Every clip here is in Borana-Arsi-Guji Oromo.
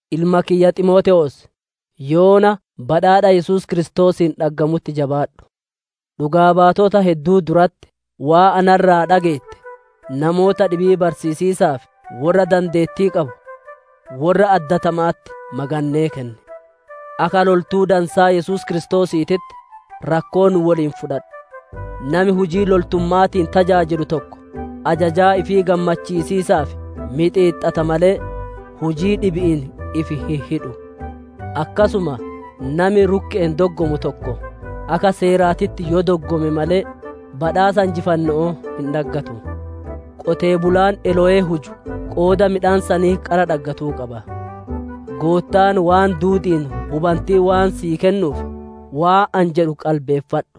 Ilma kiyya Ximootewoos, yoona badhaadha Yesuus Kiristoosiin dhaggamutti jabaadhu. Dhugaa baatota hedduu duratti waan na irraa dhageette, namoota dhibii barsiisiisaaf worra dandeettii qabu, worra addatama'atti magannee kenni. Akka loltuu dansaa Yesuus Kiristoosiititti, rakkoo nu woliin fudhadhu. Nami hujii loltumma'aatiin tajaajilu tokko, ajajaa ifii gammachiisiisaaf mixiixxata malee, hujii dhibi'iin ifi hin hidhu. Akkasuma nami rukke'een doggomu tokko, akka seeraatitti yoo doggome malee, badhaasa injifanno'oo hin dhaggatu. Qonnaan bulaan elowee huju qooda midhaan sanii qara dhaggatuu qaba. Goottaan waan duudi'iin hubantii waan sii kennuuf, waan ani jedhu qalbeeffadhu.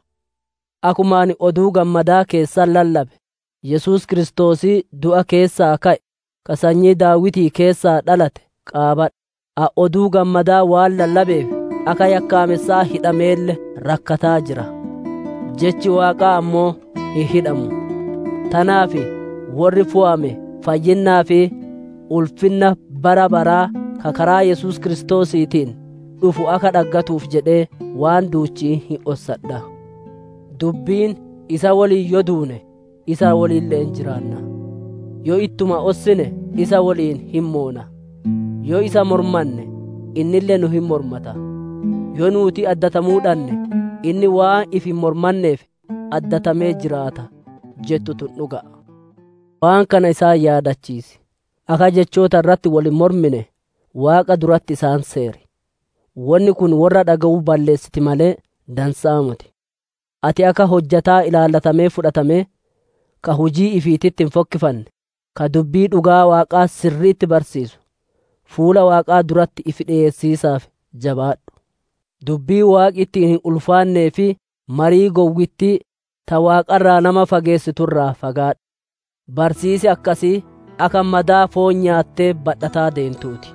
Akkuma ani Oduu Gammadaa keessatti lallabe, Yesuus Kiristoosii du'a keessaa ka'e, ka sanyii Daawitii keessaa dhalate, qaabadhu. Ani Oduu Gammadaa waan lallabeef akka yakkaamessaa hidhameelle rakkataa jira. Jechi Waaqaa ammoo hin hidhamu. Tanaaf, worri fooyame fayyinnaa fi ulfinna bara baraa ka karaa Yesuus Kiristoosiitiin dhufu akka dhaggatuuf jedhee waan duuchii hin ossadha. Dubbiin, «Isa woliin yoo duune, isa wolille'een jiraanna. Yoo ittuma ossine isa woliin hin moona. Yoo isa mormanne, innille nu hin mormata. Yoo nuuti addatamuu dhanne, inni waan ifi hin mormanneef, addatamee jiraata» jettu tun dhuga'a. Waan kana isaan yaadachiis, akka jechoota irratti wol hin mormine Waaqa duratti isaan seeri. Wonni kun worra dhage'u balleessiti malee, dansa'aa moti. Ati akka hojjataa ilaallamee fudhatamee, ka hujii ifiititti hin fokkifanne, ka dubbii dhugaa Waaqaa sirri'itti barsiisuu, fuula Waaqaa duratti ifi dhiyeessiisaaf jabaadhu. Dubbii Waaqi ittiin hin ulfaannee fi marii gowwittii, ta Waaqa irraa nama fageessitu irraa fagaadhu. Barsiisi akkasii akka madaa foon nyaattee badhataa deentuu ti.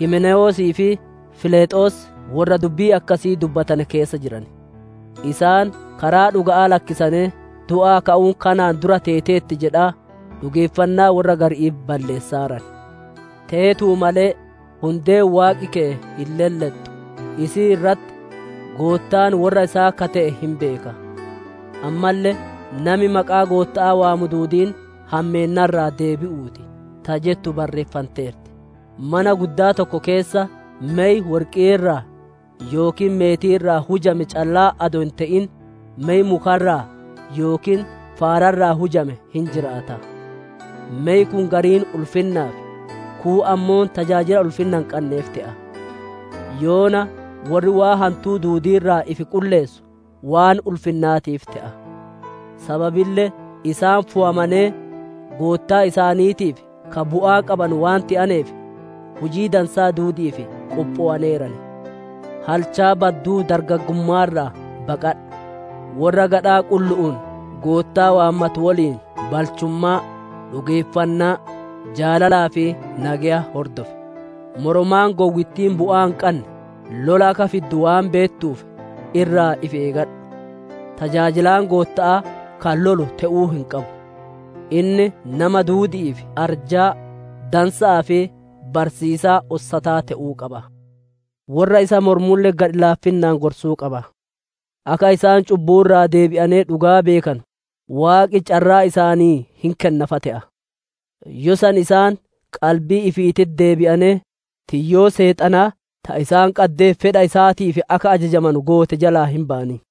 Himnewoosii fi Filexoos worra dubbii akkasii dubbatane keessa jiran. Isaan karaa dhuga'aa lakkisanee, du'aa ka'uun kanaan dura teeteerti jedhaa dhugeeffannaa worra gari'ii balleessaaran. Teetuu malee hundeen Waaqi keye hin lellexxu; isii irratti, «Goottaan worra isaa ka te'e hin beeka», ammalle «Nami maqaa Gootta'aa waamu duudiin hammeenna irraa deebi'uu ti» ta jettu barreeffanteerti. Mana guddaa tokko keessa mey worqii irraa yookiin meetii irraa hujame callaa adoo hin te'in, mey muka irraa yookiin faara irraa hujame hin jiraata; mey kun gariin ulfinnaaf, kuun ammoo tajaajila ulfinna hin qanneef te'a. Yoona worri waan hantuu duudii irraa ifi qulleessu, waan ulfinnaatiif te'a; sababille isaan fooyamanee, Goottaa isaaniitiif ka bu'aa qabanu waan te'aneef, hujii dansaa duudi'iif qophowaneeran. Halchaa badduu dargaggumma'aa irraa baqadhu; worra gadhaa qullu'uun Goottaa waammatu woliin balchummaa, dhugeeffannaa, jaalalaa fi nageya hordof. Moromaan gowwittiin bu'aa hin qanne lola akka fiddu waan beettuuf, irraa ifi eegadhu. Tajaajilaan Gootta'aa ka lolu te'uu hin qabu. Inni nama duudi'iif arjaa, dansa'aa fi barsiisaa ossataa te'uu qaba. Worra isa mormulle gadhi-laafinnaan gorsuu qaba. Akka isaan cubbuu irraa deebi'anee dhugaa beekanu, Waaqi carraa isaanii hin kenna fa te'a. Yoo san isaan qalbii ifiititti deebi'anee, tiyyoo Seexanaa ta isaan qaddee fedha isaatiif akka ajajamanu goote jalaa hin bayan.